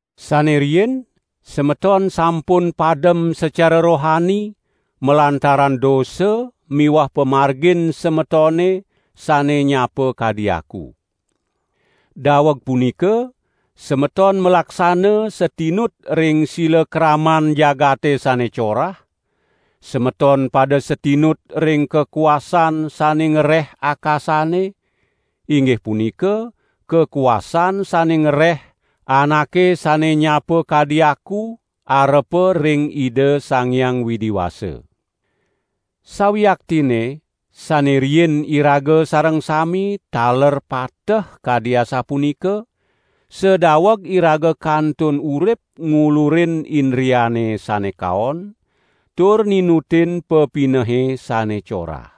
Sane riin semeton sampun padem sacara rohani malantaran dosa miwah pamargin semetone sane nyapa kadi aku. Daweg punika semeton malaksana satinut ring silakraman jagate sane corah; semeton pada satinut ring kakuasan sane ngreh akasane, inggih punika kakuasan sane ngreh anake sane nyapa kadi aku arepa ring Ida Sang Hyang Widi Wasa. Sawiaktinne sane riin iraga sareng sami taler pateh kadi asapunika, sadaweg iraga kantun urip ngulurin indriane sane kaon, tur ninutin pepinehe sane corah.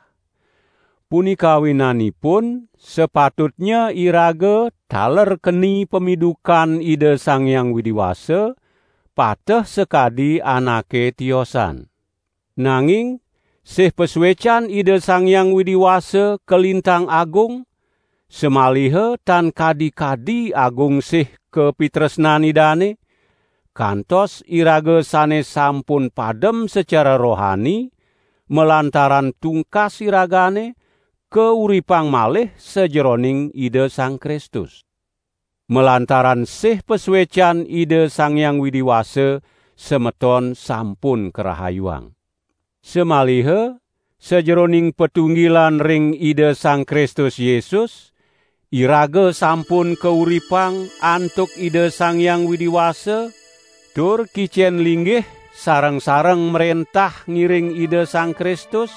Punika awinanipun sapatutnya iraga taler keni pamidukan Ida Sang Hyang Widi Wasa, pateh sakadi anake tiosan. Nanging sih pasuecan Ida Sang Hyang Widi Wasa kalintang agung, samaliha tan kadi-kadi agung sih kapitresnan Idane, kantos iraga sane sampun padem sacara rohani malantaran tungkas iragane, kauripang malih sajeroning Ida Sang Kristus. Malantaran sih pasuecan Ida Sang Hyang Widi Wasa semeton sampun karahayuang. Samaliha sajeroning patunggilan ring Ida Sang Kristus Yesus, iraga sampun kauripang antuk Ida Sang Hyang Widi Wasa tur kicen linggih sareng-sareng mrentah ngiring Ida Sang Kristus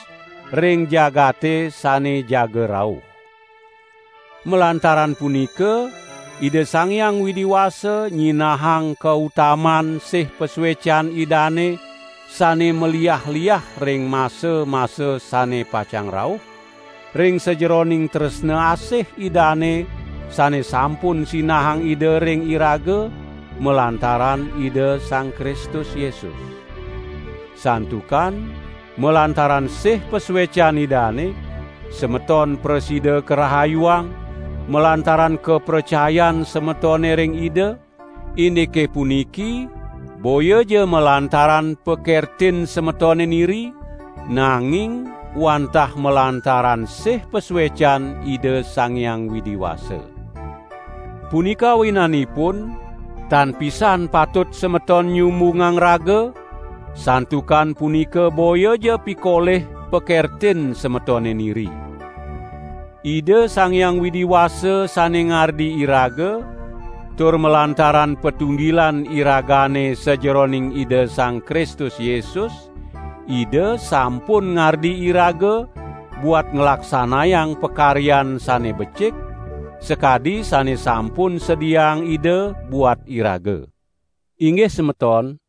ring jagate sane jaga rauh. Malantaran punika Ida Sang Hyang Widi Wasa nyinahang kautaman sih pasuecan Idane sane maliah-liah ring masa-masa sane pacang rauh, ring sajeroning tresna asih Idane sane sampun sinahang Ida ring iraga, malantaran Ida Sang Kristus Yesus. Santukan malantaran sih pasuecan Idane, semeton prasida karahayuang, malantaran kapracayan semetone ring Ida; indike puniki boyaja malantaran pakertin semetone niri, nanging wantah malantaran sih pasuecan Ida Sang Hyang Widi Wasa. Punika awinanipun tan pisan patut semeton nyumbungang raga santukan punika boyaja pikolih pakertin semetone niri. Ida Sang Hyang Widi Wasa sane ngardi iraga, tur malantaran patunggilan iragane sajeroning Ida Sang Kristus Yesus, Ida sampun ngardi iraga buat nglaksanayang pakaryan sane becik, sakadi sane sampun sediaang Ida buat iraga. Inggih semeton,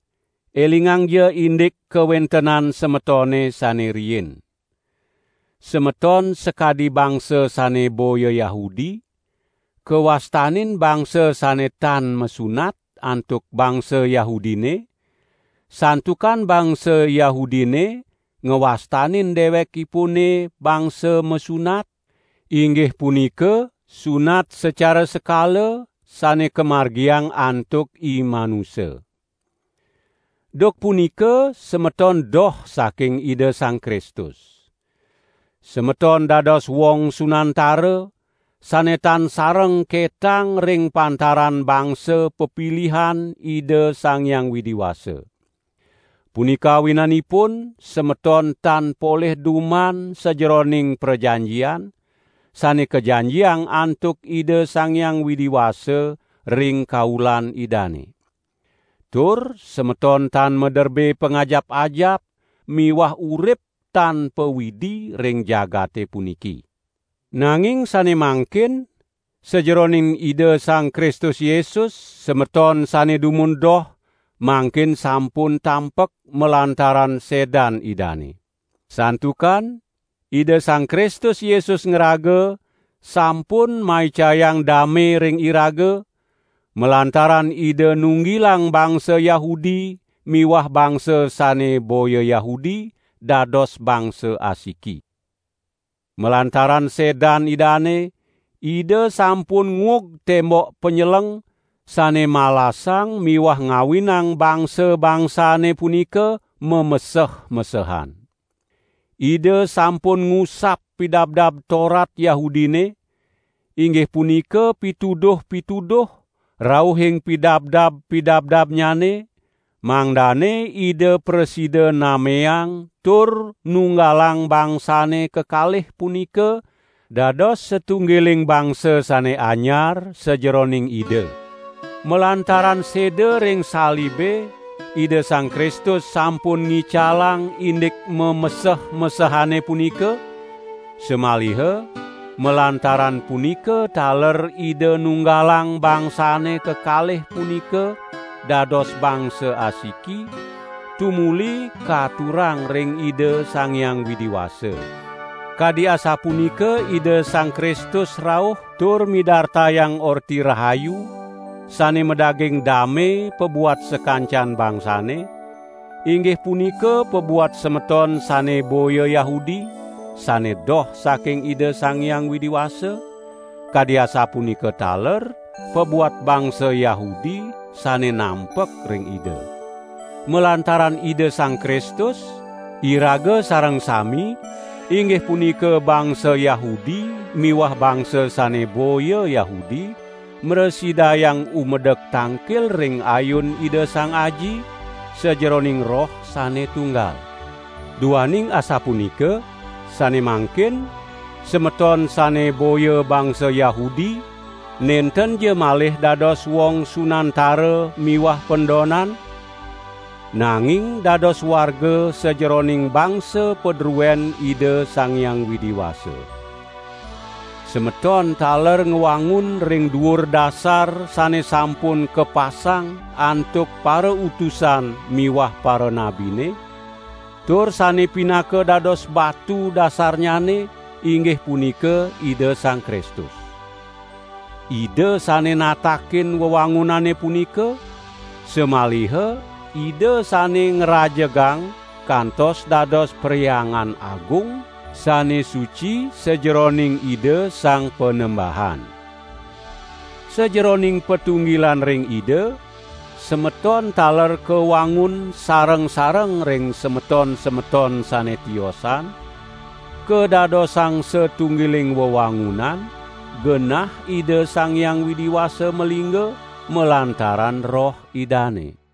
elingangja indik kawentenan semetone sane riin. Semeton sakadi bangsa sane boya Yahudi, kawastanin bangsa sane "tan masunat" antuk bangsa Yahudine, santukan bangsa Yahudine ngwastanin dewekipune bangsa "masunat", inggih punika sunat sacara sekala sane kamargiang antuk imanusa. Duk punika semeton doh saking Ida Sang Kristus. Semeton dados wong sunantara, sane tan sareng ketang ring pantaran bangsa pepilihan Ida Sang Hyang Widi Wasa. Punika awinanipun semeton tan polih duman sajeroning prajanjian, sane kajanjiang antuk Ida Sang Hyang Widi Wasa ring kaulan Idane. Tur semeton tan maderbe pangajap-ajap miwah urip tan pa-Widi ring jagate puniki. Nanging sane mangkin sajeroning Ida Sang Kristus Yesus, semeton sane dumun doh, mangkin sampun tampek malantaran sedan Idane. Santukan Ida Sang Kristus Yesus ngraga sampun maicayang dame ring iraga, malantaran Ida nunggilang bangsa Yahudi miwah bangsa sane boya Yahudi dados bangsa asiki. Malantaran sedan Idane, Ida sampun nguug tembok panyeleng, sane malasang miwah ngawinang bangsa-bangsane punika mameseh-mesehan. Ida sampun ngusap Pidabdab Torat Yahudine, inggih punika pituduh-pituduh rauhing pidabdab-pidabdabnyane, mangdane Ida prasida nameang tur nunggalang bangsane kekalih punika dados satunggiling bangsa sane anyar sajeroning Ida. Malantaran seda ring salibe Ida Sang Kristus sampun ngicalang indik mameseh-mesehane punika; samaliha malantaran punika taler Ida nunggalang bangsane kekalih punika dados bangsa asiki, tumuli katurang ring Ida Sang Hyang Widi Wasa. Kadi asapunika Ida Sang Kristus rauh tur midartayang Orti Rahayu sane madaging dame pabuat sakancan bangsane, inggih punika pabuat semeton sane boya Yahudi, sane doh saking Ida Sang Hyang Widi Wasa, kadi asapunika taler pabuat bangsa Yahudi sane nampek ring Ida. Malantaran Ida Sang Kristus, iraga sareng sami, inggih punika bangsa Yahudi miwah bangsa sane boya Yahudi mrasidayang umedek tangkil ring ayun Ida Sang Aji, sajeroning Roh sane tunggal. Duaning asapunika, sane mangkin, semeton sane boya bangsa Yahudi nentenja malih dados wong sunantara miwah pendonan, nanging dados warga sajeroning bangsa padruen Ida Sang Hyang Widi Wasa. Semeton taler ngwangun ring duur dasar sane sampun kapasang antuk parautusan miwah paranabine, tur sane pinaka dados batu dasarnyane inggih punika Ida Sang Kristus. Ida sane natakin wewangunane punika, samaliha Ida sane ngrajegang kantos dados Perhyangan Agung sane suci sajeroning Ida Sang Panembahan. Sajeroning patunggilan ring Ida, semeton taler kawangun sareng-sareng ring semeton-semeton sane tiosan, kadadosang satunggiling wewangunan, genah Ida Sang Hyang Widi Wasa malingga, malantaran Roh Idane.